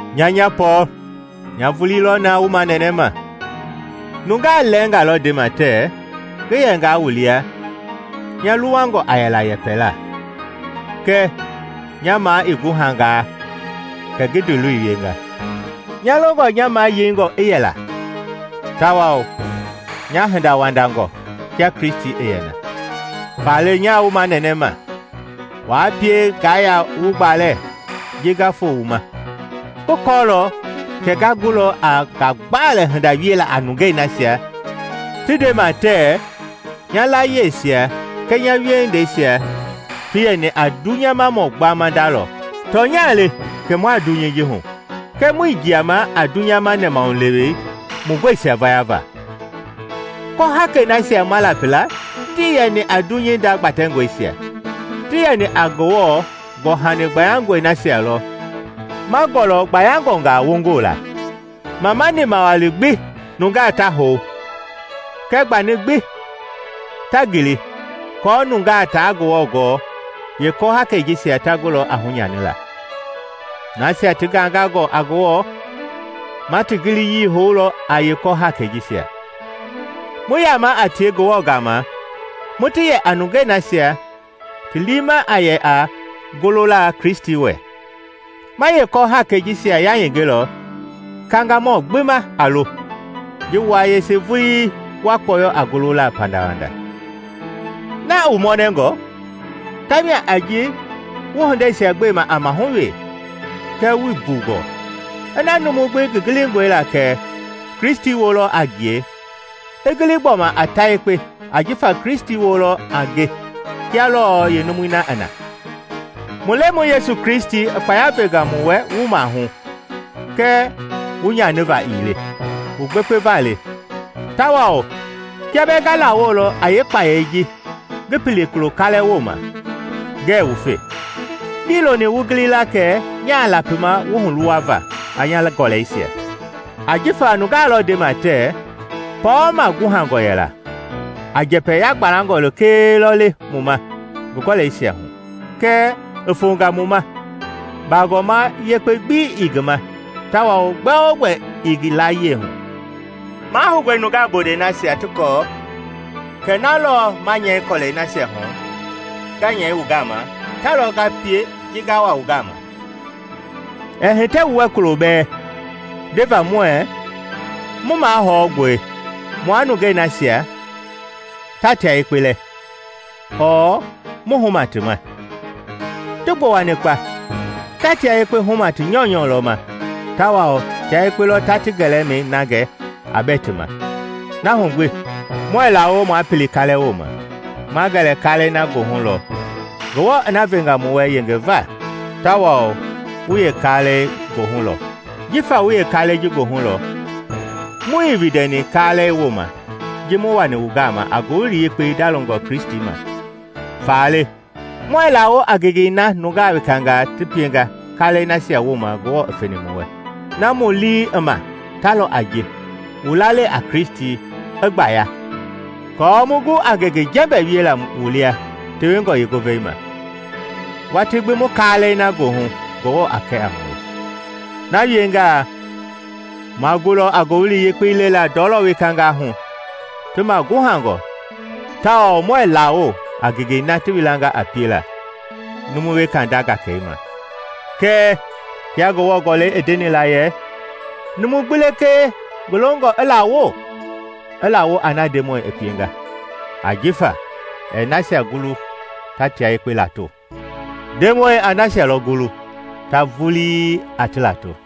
Nya, nya Pɔɔl nya vulii lɔ naa wu manɛnɛma. Nungaa lɛɛnga lɔ ndema tɛ ngi yɛngaa wu lia nya luwangɔ a yɛla a yɛpɛla, kɛɛ nya maa i guhangaa kɛ ngi ndiiloi wienga. Nya longɔ nya mayeingɔ i yɛla tawao nya hindawandangɔ kia Kristi i yɛ na. Faale nyaa wu manɛnɛma, waa pie ngaa yaa wu gbalɛ ji nga foo wu ma! Ngi kɔɔlɔ kɛ nga gulɔ a ngagbalɛ hinda wiela a nungei nasia ti ndema tɛɛ nya layieisia kɛɛ nya wiehindeisia ti yɛni a dunyamamɔ gbama nda lɔ. Tɔnya le kɛ mua dunyei ji hu kɛɛ muii jiama a dunyama nɛmahulewe mu gɔisia vayava. Kɔhakei nasia ma lapi la tii yɛni a dunyei nda gbatɛngɔisia, ti yɛni a Ngewɔ gɔ-hani gbayangɔi nasia lɔ ma gɔlɔ gbayangɔngaa wongoo la. Mamani mawali gbi nungaa ta hou kɛɛ gbani gbi ta ngili aako nungaa taa Ngewɔ gɔɔ, yeekɔ-haakei jisia ta gulɔ a hunyanila. Nasia ti gangangɔ a Ngewɔ, ma ti giliyii houlɔ a yeekɔ-haakɛi jisia, mu yama a tie Ngewɔ gama mu ti yɛ a nungei nasia ti liima a yɛ a golola Kristi lɔ wɛ. Ma yeekɔ-haakɛi jisia yayengelɔ kangamɔ gbi ma a lo, ji wua yese vulii wa kpɔyɔ a golola pandawanda. Na i wu mɔnɛngɔ tamia a ji wu hindeisia gbema a mahu we kɛɛ wuii mbu gɔɔ. Ina numu gbi ngi gilingɔe la kɛ Kristi woo lɔ a ngie, i gili gbɔma a ta yekpe ajifa Kristi woo lɔ a nge kia lɔɔ yeenumui na i na. Mu Lemɔi Yesu Kristi i kpaya venga mu wɛ wu maahu kɛɛ wu nyaniva ii le; wu gbekpeva le, tawao kiaa bɛɛ nga lawolɔ a yeekpayei ngi pili kulo kaalɛ wooma, ngɛɛ wufe. Ngii loni wu gili la kɛ nyaa lapima wu huluwava a nya gɔlɛisia. Ajifa nungaa lɔ ndema tɛɛ, “Pɔɔl maguhangɔ yɛla a njɛpɛ yagbalɛngɔ lekee lɔ le mu ma ngi gɔlɛisia hu, kɛɛ i fonga mu ma baagɔma yekpe gbi ii ngi ma tawao gbɛogbɛ ii ngi layie hu.” Mahoungɔe nungaa bondɛi nasia ti kɔɔ kɛ na lɔɔ ma nyɛi kɔlɛi nasia hu nga nyɛi wu gama, ta lɔ nga pie ji nga wa wu gama. Ɛɛ hitɛ mu wɛ kulo bɛɛ ndeva muɛɛ mu mahɔngɔe mua nungei nasia ta tia yekpe lɛ ɔɔ mu huma ti ma. Ti gbowani kpa! Ta tia yekpe huma ti nyɔunyɔ lɔ ma tawao tia yekpe lɔ ta ti gɛlɛmɛi na gɛ a bɛ ti ma. Na hu gbi muɛɛ lawo maa pili kaalɛ wooma; ma gɛlɛ kaalɛi na goohu lɔ Ngewɔ i na venga mu wɛ yengeva na tawao wu yeekaalɛi goohu lɔ. Jifa wu yeekaalɛi ji goohu lɔ, muii windɛni kaalɛ wooma ji mu wani wu gama a Ngowili Yekpei ndalongɔ Kristi ma. Faale muɛɛ lawo a ngengei na nungaa wekangaa ti pienga kaalɛi nasia wooma Ngewɔ i feni mu wɛ. Na mu lii i ma ta lɔ a ji wu lalei a Kristi a gbaya aako mu gu a ngenge jɛmbɛ wiela wu lia tewengɔ yeengovei ma, watii gbi mu kaalɛi na goohu Ngewɔ a kɛ a mue. Na wiengaa ma gulɔ a Ngowili Yekpei lelaa ndɔlɔ wekangaa hu ti ma guhangɔ tawao muɛɛ lawo a ngengei na ti wilanga a piela numu weka nda gakamɛi. Kɛɛ kia Ngewɔ Gɔlɛi i ndeni la yɛ, “Numu gbi lekee ngi longɔ i lawo, i laawo a na Ndemɔi i pienga.” Ajifa ɛɛ nasia gulu ta tia yekpe lato, Ndemɔi a nasia lɔ gulu ta vulii a ti lato.